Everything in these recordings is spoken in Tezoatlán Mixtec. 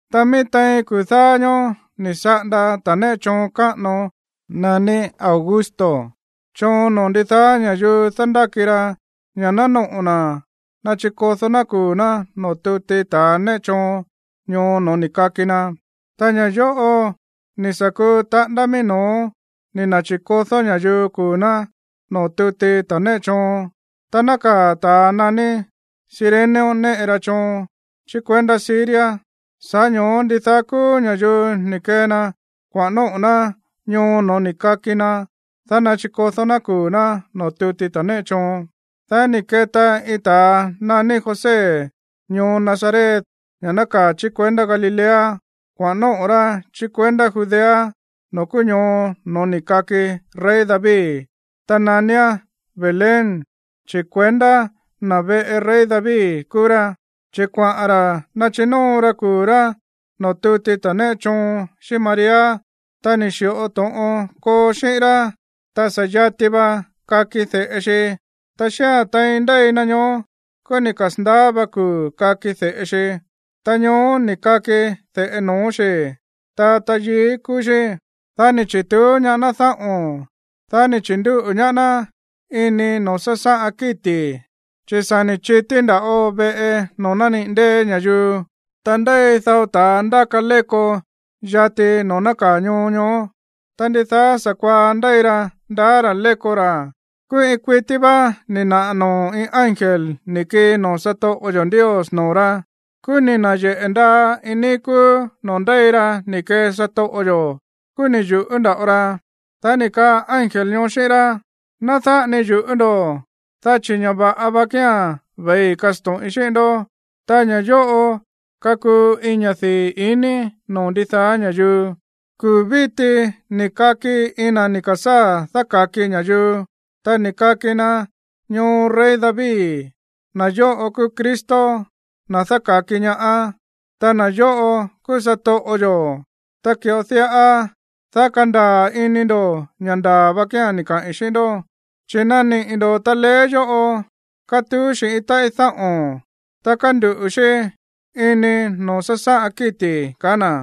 Ta mií tein kuu̱ dáá ñóó ni̱ saꞌanda ta̱ néꞌe choon káꞌano naní Augusto choon noo̱ ndidaá ña̱yuu dándáki ra ña̱ ná noꞌo̱ na̱ nachikodó ná kuu̱ ná noo̱ tuti ta̱a néꞌe choon ñoo no̱ó ni̱ kaki na. Ta ña̱ yóꞌo ni̱ sa̱ kuu taꞌándá mií no̱ó ni̱ na̱chi̱kodó ña̱yuu kuu̱ ná noo̱ tuti ta̱ néꞌe choon tá nákaa̱ ta̱a naní Cirenio néꞌe ra choon chí kuendá Siria. Sa̱ꞌá ño̱ó ndidaá kúú ña̱yuu ni̱ kee na kuaꞌa̱n nóꞌo̱ ná ñoo no̱ó ni̱ kaki na, dá nachikodó ná kuu̱ ná noo̱ tuti ta̱a néꞌe choon. Dá ni̱ keta iin ta̱a naní José ñoo Nazaret, ña̱ nákaa̱ chí kuendá Galilea, kuaꞌa̱n nóꞌo̱ rá chí kuendá Judea noo̱ kúú ñoo no̱ó ni̱ kaki rey David, ta naníán Belén. Chi̱ kuendá na̱ veꞌe rey David kúú rá, chi̱ kuaꞌa̱n ra̱ nachinóo ra kuu̱ rá noo̱ tuti ta̱ néꞌe choon xíꞌín María, ta ni̱ xi̱ꞌo to̱ꞌon koo xíꞌín rá. Ta sa̱ yati va kaki de̱ꞌe xi. Ta xía̱n tein ndéi na ñoó, kúú ni̱ kasa̱ndaá va kuu̱ kaki de̱ꞌe xi. Ta ñoó ni̱ kaki de̱ꞌe no̱ó xi̱, ta tayií kúú xí. Dá ni̱ chi̱tuú ñaá ná dáꞌo̱n. Dá ni̱ chi̱ndúꞌu̱ ñaá ná ini noo̱ sásáꞌan kíti̱, chi̱ sa̱ ni̱ chití nda̱ꞌo veꞌe noo̱ nániꞌi̱ ndée̱ ña̱yuu. Ta ndéi dao ta̱a ndáka léko yati noo̱ nákaa̱ ñoo ñoó, ta ndidaá sa̱kuaá ndéi ra ndaá ra̱ léko ra̱. Kúú iin kuití vá ni̱ naꞌa̱ noo̱ iin ángel ni̱ kii noo̱ satoꞌo yo̱ Ndios noo̱ rá. Kúú ni̱ na̱yeꞌe̱ ndaa iin níí kúú noo̱ ndéi ra ni̱ kee satoꞌo yo̱. Kúú ni̱ yu̱ꞌú nda̱ꞌo ra. Dá ni̱ kaa ángel ñoó xíꞌín rá: ―Ná dáꞌa ni yu̱ꞌú ndo̱, dá chi̱ ña̱ va̱ꞌa va kía̱n ve̱ii kasto̱ꞌin xíꞌín ndó. Ta ña̱ yóꞌo kakuu iin ña̱ dii̱ iní noo̱ ndidaá ña̱yuu. Kuu̱ víti ni̱ kaki iin na̱ ni̱ ka̱sáa̱ dáka̱ki ña̱yuu. Ta ni̱ kaki na ñoo rey David. Na̱ yóꞌo kúú Cristo, na̱ dáka̱ki ñaá, ta na̱ yóꞌo kúú satoꞌo yo̱. Ta ki̱ꞌo diꞌa, dá kandaa̱ ini ndo̱ ña̱ ndaa̱ va kía̱n ni̱ kaꞌi̱n xíꞌín ndó. Chi̱ naniꞌi̱ ndo̱ taleé yóꞌo kátuú xi̱ iin táꞌí dáꞌo̱n, ta kánduꞌu̱ xí ini noo̱ sásáꞌan kíti̱ ―kaá na̱.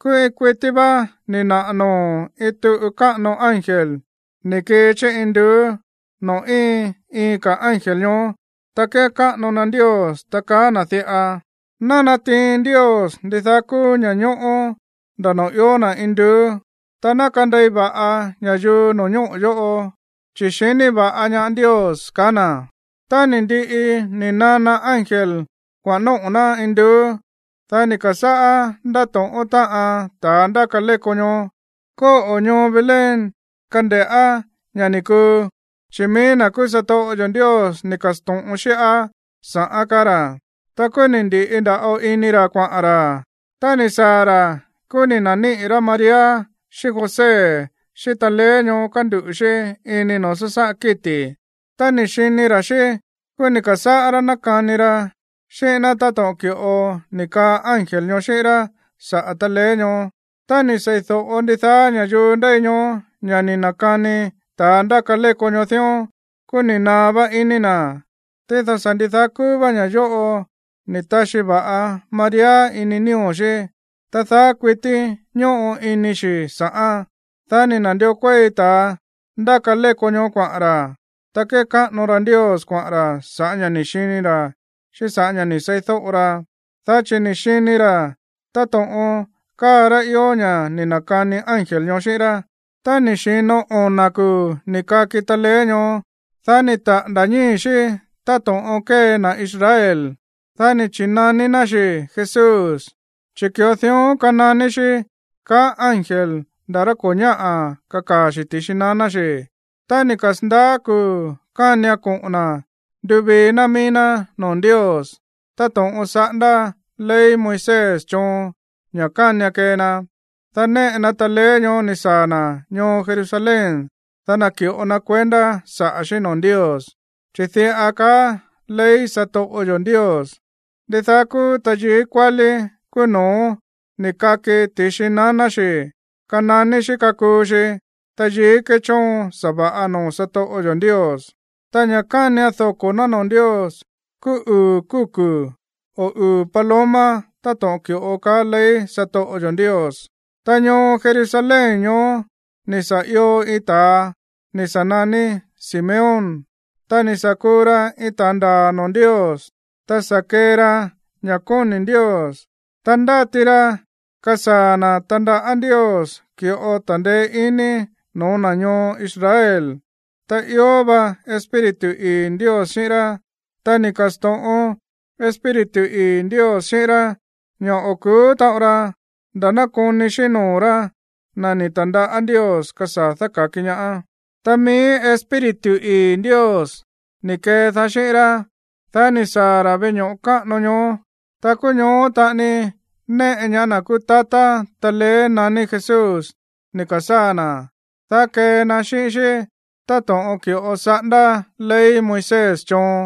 Kúú iin kuití vá ni̱ naꞌa̱ noo̱ iin tuꞌu káꞌano ángel ni̱ kii chí induú noo̱ íin iin ka̱ ángel ñoó, ta kékáꞌano na Ndios, ta kaá na̱ diꞌa: Ná natiin Ndios ndidaá kúú ña̱ñóꞌó nda̱ noo̱ ió na̱ induú. Ta ná kandei va̱ꞌa ña̱yuu no̱ñóꞌo̱ yóꞌo, chi̱ xiní va̱ꞌa ñaá Ndios. Tá ni̱ ndiꞌi ni̱ nana ángel kuaꞌa̱n nóꞌo̱ ná induú, dá ni̱ ka̱sáꞌá ndátóꞌón táꞌan ta̱a ndáka léko ñoó: ―Kóꞌo̱ ñoo Belén kande̱ꞌá ña̱ ni̱ kuu, chi̱ mií na̱ kúú satoꞌo yo̱ Ndios ni̱ ka̱sto̱ꞌon xíꞌá sa̱ꞌán ―kaá ra̱. Ta kúú ni̱ ndi̱ꞌi nda̱ꞌo ini ra̱ kuaꞌa̱n ra̱. Tá ni̱ saa̱ ra̱, kúú ni̱ na̱níꞌi̱ rá María xíꞌín José xíꞌín taleé ñoó kánduꞌu̱ xí ini noo̱ sásáꞌan kíti̱. Tá ni̱ xini ra̱ xí, kúú ni̱ ka̱sáꞌá rá nákani ra xíꞌín ná táto̱ꞌon ki̱ꞌo ni̱ kaa ángel ñoó xíꞌín rá saꞌa̱ taleé ñoó. Tá ni̱ sei̱do̱ꞌo ndidaá ña̱yuu ndéi ñoó ña̱ ni̱ na̱kani ta̱a ndáka léko ñoó dión, kúú ni̱ naá vá iní na̱. Tído sa̱ ndidaá kúú vá ña̱ yóꞌo ni̱ taxi va̱ꞌa María nío̱ xí, ta daá kuití ñóꞌo ini xi̱ sa̱ꞌán. Dá ni̱ na̱ndió kuéi ta̱a ndáka léko ñoó kuaꞌa̱n ra̱. Ta kékáꞌano ra Ndios kuaꞌa̱n ra̱ sa̱ꞌá ña̱ ni̱ xini ra̱ xíꞌín sa̱ꞌá ña̱ ni̱ seídóꞌo ra. Dá chi̱ ni̱ xini ra̱ táto̱ꞌon káa rá ió ña̱ ni̱ na̱kani ángel ñoó xíꞌín rá. Tá ni̱ xi̱no ona̱ kuu̱ ni̱ kaki taleé ñoó, dá ni̱ taꞌa̱nda̱ ñíi̱ xí táto̱ꞌon kée na̱ Israel. Dá ni̱ chi̱naní ná xi̱ Jesús, chi̱ ki̱ꞌo dión kananí xí kaá ángel nda̱ rá ko̱ ñáꞌa̱ kakaa̱ xi̱ ti̱xi naná xi̱. Tá ni̱ kasa̱ndaá kuu̱ kánian koꞌo̱n na̱ nduvií ná mií ná noo̱ Ndios, táto̱ꞌon saꞌándá ley Moisés choon ña̱ kánian kee na, dá néꞌe na taleé ñoó ni̱ saa̱ na̱ ñoo Jerusalén, dá naki̱ꞌo na kuendá saꞌa̱ xí noo̱ Ndios. Chi̱ diꞌa kaá ley satoꞌo yo̱ Ndios: “Ndidaá kúú tayií kuálí kúú no̱ó ni̱ kaki ti̱xi naná xi̱ kananí xí kakuu xi tayií kechóon sa̱va̱ꞌa noo̱ satoꞌo yo̱ Ndios.” Ta ña̱ kánian doko̱ ná noo̱ Ndios kúú uu̱ kúku̱ o uu̱ paloma táto̱ꞌon ki̱ꞌo kaá ley satoꞌo yo̱ Ndios. Ta ñoo Jerusalén ñoó ni̱ sa̱ io iin ta̱a ni̱ sa̱ naní Simeón. Ta ni̱ sa̱ kuu ra iin ta̱a ndaa̱ noo̱ Ndios, ta sa̱ kee ra ña̱ kóni̱ Ndios. Ta ndáti ra kasaa̱ na̱ tandaꞌá Ndios ki̱ꞌo ta̱ndeé iní no̱ó na̱ ñoo Israel. Ta ió va Espíritu ii̱ Ndios xíꞌín rá. Ta ni̱ ka̱sto̱ꞌon Espíritu ii̱ Ndios xíꞌín rá ña̱ o̱ ku̱ú taꞌon ra nda̱ ná koni xíꞌín noo̱ rá na̱ ni̱ ta̱ndaꞌá Ndios kasaa̱ dáka̱ki ñaá. Ta mií Espíritu ii̱ Ndios ni̱ kedaá xíꞌín rá, dá ni̱ saa̱ ra̱ veꞌe ño̱ꞌo káꞌano ñoó. Ta kúú ñoó taꞌani néꞌe ñaá na̱ kúú tatá taleé naní Jesús ni̱ ka̱sáa̱ na̱, dá kee na xíꞌín xí táto̱ꞌon ki̱ꞌo saꞌándá ley Moisés choon.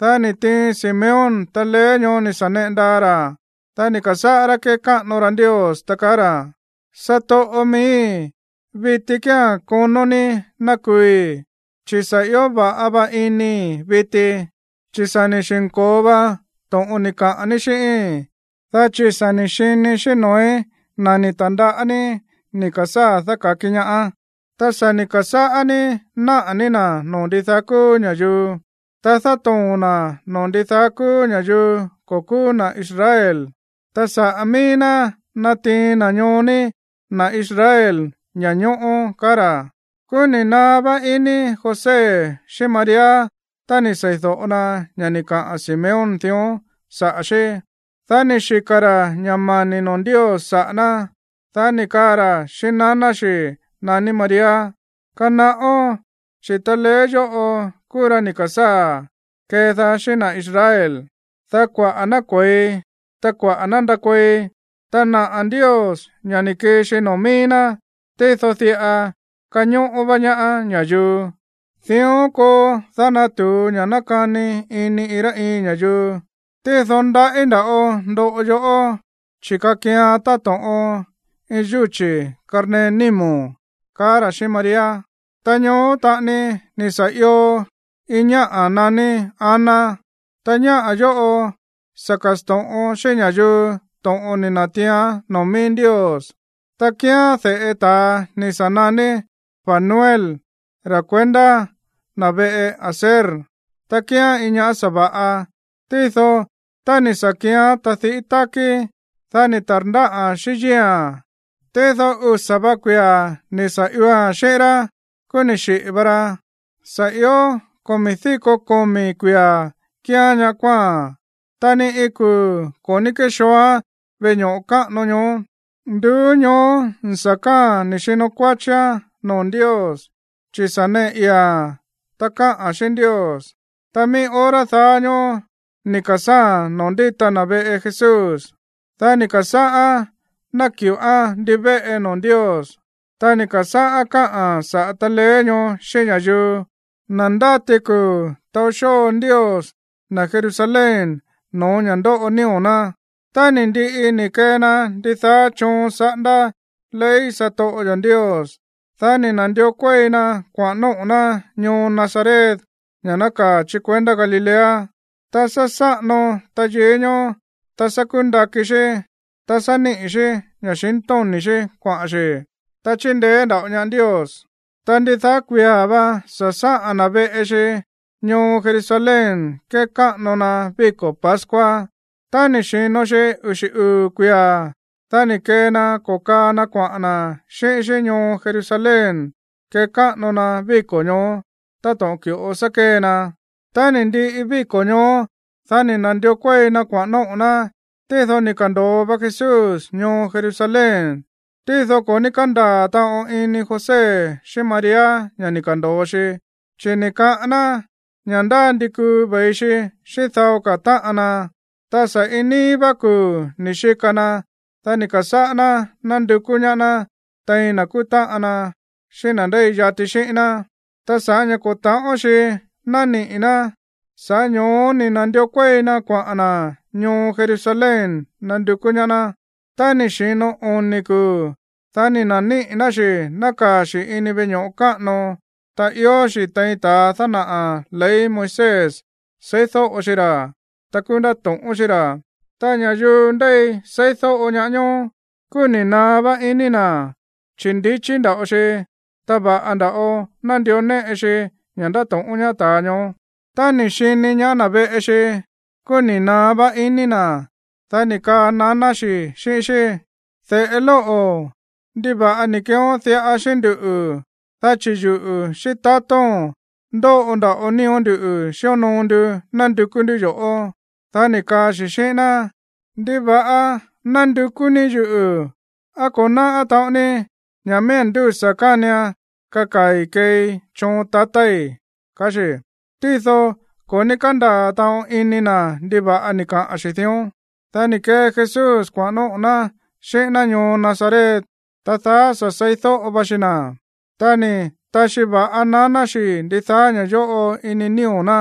Dá ni̱ tiin Simeón taleé ñoó ni̱ sa̱ neꞌe ndaa ra̱. Dá ni̱ ka̱sáꞌá rá kékáꞌano ra Ndios, ta kaá ra̱: Satoꞌo miíi̱, viti kía̱n konó ní ná kuui̱, chi̱ sa̱ ió va̱ꞌa va inii̱ viti, chi̱ sa̱ ni̱ xi̱nko̱o va to̱ꞌon ni̱ kaꞌa̱n ní xíꞌíi̱n, dá chi̱ sa̱ ni̱ xinii̱ xíꞌín noo̱í na̱ ni̱ ta̱ndaꞌá ní ni̱ ka̱sáa̱ dáka̱ki ñaá. Ta sa̱ ni̱ ka̱sáꞌá ní náꞌa̱ ní na̱ noo̱ ndidaá kúú ña̱yuu. Ta dátoo̱n na̱ noo̱ ndidaá kúú ña̱yuu ko̱ kúú na̱ Israel. Ta saꞌa̱ mií ná natiin na̱ ñoo ní, na̱ Israel, ña̱ñóꞌó. Kúú ni̱ naá vá iní José xíꞌín María tá ni̱ sei̱do̱ꞌo na ña̱ ni̱ kaꞌa̱n Simeón dión saꞌa̱ xí. Dá ni̱ xika̱ ra̱ ña̱ mani̱ noo̱ Ndios saꞌa̱ ná. Dá ni̱ kaa ra̱ xíꞌín naná xi̱ naní María: ―Kanaꞌón, chi̱ taleé yóꞌo kúú ra ni̱ ka̱sáa̱ kedaá xíꞌín na̱ Israel, dá kuaꞌa̱ ná kue̱i, ta kuaꞌa̱ ná ndakuei. Ta naꞌa̱ Ndios ña̱ ni̱ kii xi noo̱ mií ná, tído diꞌa kañóꞌó vá ñaá ña̱yuu. Dión koo, dá ná natu̱u ña̱ nákani ini iin rá iin ña̱yuu. Tído ndaꞌí nda̱ꞌo ndoꞌo yoꞌó, chi̱ kakian táto̱ꞌon iin yúchi̱ karnee nímo̱n ―kaá ra̱ xíꞌín María. Ta ñoó taꞌani ni̱ sa̱ io iin ñáꞌa̱ naní Ana. Ta ñáꞌa̱ yóꞌo sa̱ ka̱sto̱ꞌon xíꞌín ña̱yuu to̱ꞌon ni̱ na̱tiián noo̱ mií Ndios. Ta kíán de̱ꞌe ta̱a ni̱ sa̱ naní Fanuel, ra̱ kuendá na̱ veꞌe Aser. Ta kíán iin ñáꞌa̱ sa̱va̱ꞌa. Tído tá ni̱ sa̱ kíán tadiꞌí tákí, dá ni̱ ta̱rndáꞌa̱n xíꞌín yíi̱a̱n, tído usa̱ va kuia̱ ni̱ sa̱ ioa̱n xíꞌín rá, kúú ni̱ xiꞌi̱ va ra. Sa̱ ió komi̱ díko komi̱ kuia̱ kíán ñaꞌá kuáa̱n, ta ni iin kuu̱ ko̱ ní kéxooán veꞌe ño̱ꞌo káꞌano ñoó. Nduú ñoó sa̱ káa̱a̱n xíno kuáchíán noo̱ Ndios, chi̱ sa̱ neꞌe ii̱a̱n, ta káꞌa̱n xíꞌín Ndios. Ta mií hora daá ñóó ni̱ ka̱sáa̱a̱n noo̱ ndíta na̱ veꞌe Jesús. Dá ni̱ ka̱sáꞌán náki̱ꞌoán ndivéꞌe noo̱ Ndios. Ta ni̱ ka̱sáꞌán káꞌa̱n saꞌa̱ taleé ñoó xíꞌín ña̱yuu, na̱ ndáti kuu̱ taó xóo Ndios na̱ Jerusalén no̱ó ña̱ ndóꞌo nío̱ ná. Tá ni̱ ndiꞌi ni̱ kee na ndidaá choon saꞌándá ley satoꞌo yo̱ Ndios, dá ni̱ na̱ndió kuéi na kuaꞌa̱n nóꞌo̱ ná ñoo Nazaret, ña̱ nákaa̱ chí kuendá Galilea. Ta sá sáꞌano tayií ñoó, ta sá kúndakí xí, ta sá níꞌi̱ xí ña̱xintóni̱ xí kuaꞌa̱n xi̱. Ta chíndeé nda̱ꞌo ñaá Ndios. Ta ndidaá kuia̱ vá sá sáꞌa̱n na̱ veꞌe xi ñoo Jerusalén kekáꞌano na víko̱ pascua. Tá ni̱ xi̱no xi uxi̱ uu̱ kuia̱, dá ni̱ kee na ko̱kaa na kuaꞌa̱n na̱ xíꞌín xí ñoo Jerusalén kekáꞌano na víko̱ ñoó, táto̱ꞌon ki̱ꞌo sá kée na. Tá ni̱ ndiꞌi víko̱ ñoó, dá ni̱ na̱ndió kuéi na kuaꞌa̱n nóꞌo̱ ná, tído ni̱ ka̱ndo̱o va Jesús ñoo Jerusalén. Tído ko̱ ní kándaa̱ taꞌon ini José xíꞌín María ña̱ ni̱ ka̱ndo̱o xi. Chi̱ ni̱ kaꞌán ná ña̱ ndá ndi kuu ve̱i xi xíꞌín dao ka̱ táꞌan na. Ta sa̱ iin níí vá kuu̱ ni̱ xika na. Dá ni̱ ka̱sáꞌá ná nándukú ñaá ná tein na̱ kúú táꞌan na xíꞌín na̱ ndéi yati xíꞌín ná. Ta sa̱ꞌá ña̱ ko̱ ta̱ꞌón xi̱ nániꞌi̱ ná, sa̱ꞌá ño̱ó ni̱ na̱ndió kuéi na kuaꞌa̱n na̱ ñoo Jerusalén nandukú ñaá ná. Tá ni̱ xi̱no oni̱ kuu̱, dá ni̱ na̱níꞌi̱ ná xi̱ nákaa̱ xi̱ ini veꞌe ño̱ꞌo káꞌano, ta ió xi̱ tein ta̱ dánaꞌa̱ ley Moisés seídóꞌo xi ra̱, ta kúú ndáto̱ꞌón xí ra̱. Ta ña̱yuu ndéi seídóꞌo ñaá ñóó, kúú ni̱ naá vá iní na̱, chi̱ ndi̱chí nda̱ꞌo xi, ta va̱ꞌa nda̱ꞌo nándió néꞌe xi ña̱ ndáto̱ꞌón ñaá ta̱a ñoó. Tá ni̱ xini ñaá na̱ veꞌe xi, kúú ni̱ naá vá iní na̱. Dá ni̱ kaa naná xi̱ xíꞌín xí: ―De̱ꞌe lóꞌo̱, ¿ndiva̱ꞌa ni̱ keeón diꞌa xíꞌín nduꞌu̱? Dá chi̱ yuꞌu̱, xíꞌín tatóo̱n ndóꞌo nda̱ꞌo nío̱ ndú xíonoo ndu nándukú ndú yo̱ꞌó. Dá ni̱ kaa xi̱ xíꞌín ná: ―¿Ndiva̱ꞌa nándukú ní yuꞌu̱? ¿Á ko̱ náꞌá taꞌon ní ña̱ miía̱n ndúsa̱ kánian kakaa̱i̱ keei choon tatái̱? ―kaá xi̱. Tído ko̱ ní kándaa̱ taꞌon ini na̱ ndiva̱ꞌa ni̱ kaꞌa̱n xi̱ dión. Dá ni̱ kee Jesús kuaꞌa̱n nóꞌo̱ xí xíꞌín ná ñoo Nazaret. Ta daá sa̱ seídóꞌo va xi na̱. Ta ni̱ taxi va̱ꞌa naná xi̱ ndidaá ña̱ yóꞌo ini nío̱ ná.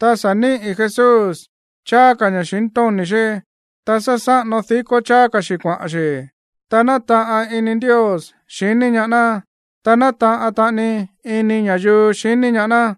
Ta sá níꞌi̱ Jesús cháá ka̱ ña̱xintóni̱ xí, ta sá sáꞌano dikó cháá ka̱ xi̱ kuaꞌa̱n xi̱. Ta nátaꞌan ini Ndios xiní ñaá ná, ta nátaꞌan taꞌani ini ña̱yuu xiní ñaá ná.